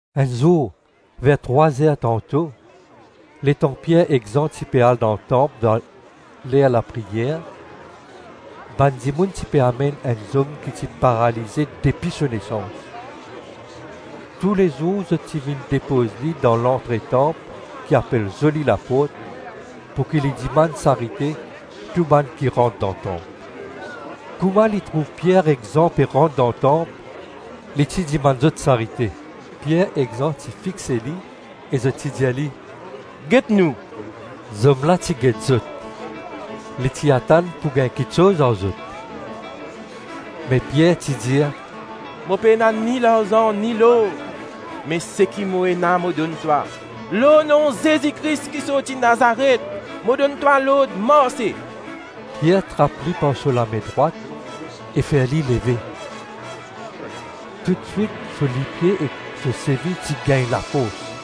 Enn zour ver trwa-zer tanto, letan Pier ek Zan ti pe al dan tanp dan ler lapriyer, bann dimoun ti pe amenn enn zom ki ti paralize depi so nesans. Toulezour zot ti vinn depoz li dan lantre tanp ki ti apel ‘Zoli Laport’ pouki li dimann sarite tou bann ki rant dan tanp. Kouma li ti trouv Pier ek Zan pe rant dan tanp, li ti dimann zot sarite. Pier ek Zan ti fixe li e zot ti dir li, “Get nou.” Zom la ti get zot, li ti atann pou gagn kiksoz ar zot. Me Pier ti dir, “Mo pena ni larzan ni lor, me seki mo ena mo donn twa, lor nom Zezi Kris ki sorti Nazaret, mo donn twa lord marse.” Pier trap li par so lame drwat e fer li leve. Toutswit so lipie ek so sevi ti gagn lafors.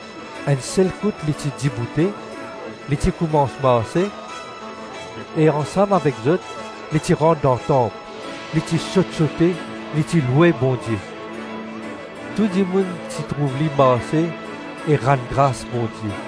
Enn sel kout li ti diboute, li ti koumans marse, e ansam avek zot, li ti rant dan tanp, li ti sot-sote, li ti loue Bondie. Tou dimoun ti trouv li marse e rann gras Bondie.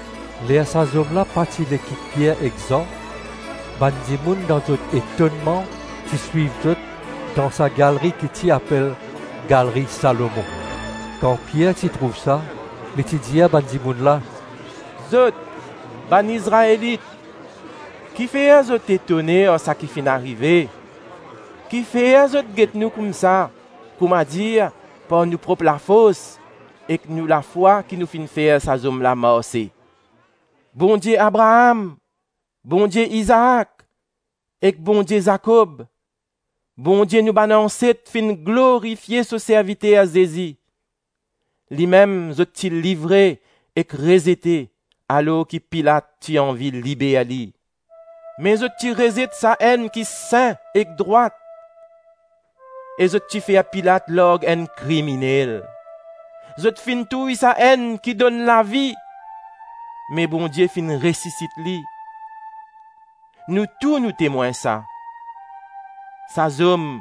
Ler sa zom la pa ti le kit Pier ek Zan, bann dimoun dan zot etonnman ti swiv zot dan sa galri ki ti apel Galri Salomon. Kan Pier ti trouv sa, li ti dir bann dimoun la, “Zot, bann Izraelit, ki fer zot etone ar saki finn arive; kifer zot get nou koumsa, koumadir par nou prop lafors ek nou lafwa ki nou finn fer sa zom la marse. Bondie Abraam, Bondie Izaak, ek Bondie Zakob, Bondie nou bann anset finn glorifie so serviter Zezi. Limem zot ti livre ek rezete alor ki Pilat ti anvi liber li. Me zot ti rezet Sa-Enn ki Sin ek Drwat e zot ti fer Pilat larg enn kriminel Zot finn touy Sa-Enn ki donn lavi, me Bondie finn resisit li. Nou tou nou temwin sa. Sa zom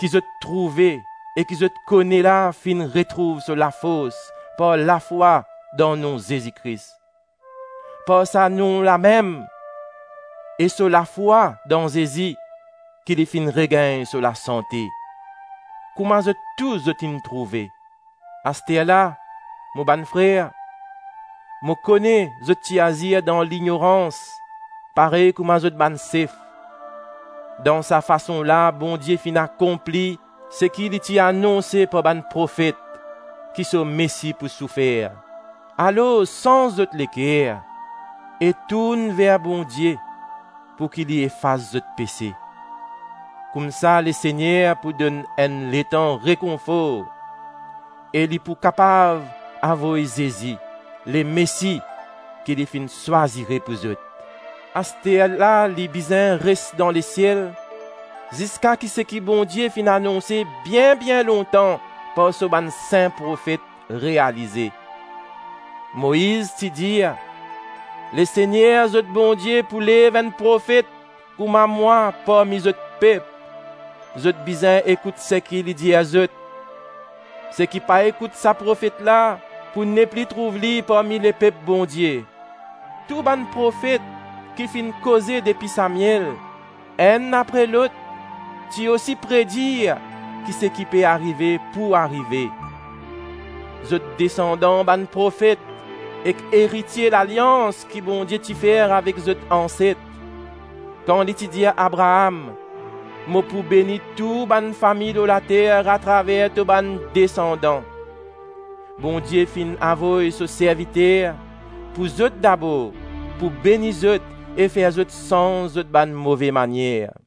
ki zot trouve e ki zot kone la finn retrouv so lafors par lafwa dan nom Zezi Kris. Par sa nom lamem e so lafwa dan Zezi ki li finn regagn so lasante, kouma zot tou zot inn trouve. Asterla, mo bann frer, mo kone zot ti azir dan lignorans parey kouma zot bann sef. Dan sa fason la Bondie finn akonpli seki li ti anonse par bann profet, ki so Mesi pou soufer. Alors, sanz zot leker e tourn ver Bondie pouki li efas zot pese, koumsa Lesegner pou donn enn letan rekonfor, e li pou kapav avoy Zezi, Lemesi ki li finn swazire pou zot. Asterla li bizin res dan lesiel ziska ki seki Bondie finn anonse bien-bien lontan par so bann sin profet, realize. Moiz ti dir, ‘Lesegner zot Bondie pou lev enn profet kouma mwa parmi zot pep. Zot bizin ekout seki li dir zot. Seki pa ekout sa profet la pou nepli trouv li parmi lepep Bondie.’ Tou bann profet ki finn koze depi Samiel, enn apre lot, ti osi predir ki seki pe arive pou arive. Zot desandan bann profet ek eritie lalians ki Bondie ti fer avek zot anset, kan li ti dir Abraam, ‘Mo pou beni tou bann fami lor later atraver to bann desandan.’ Bondie finn avoy so serviter, pou zot dabor, pou beni zot e fer zot sanz zot bann move manier.”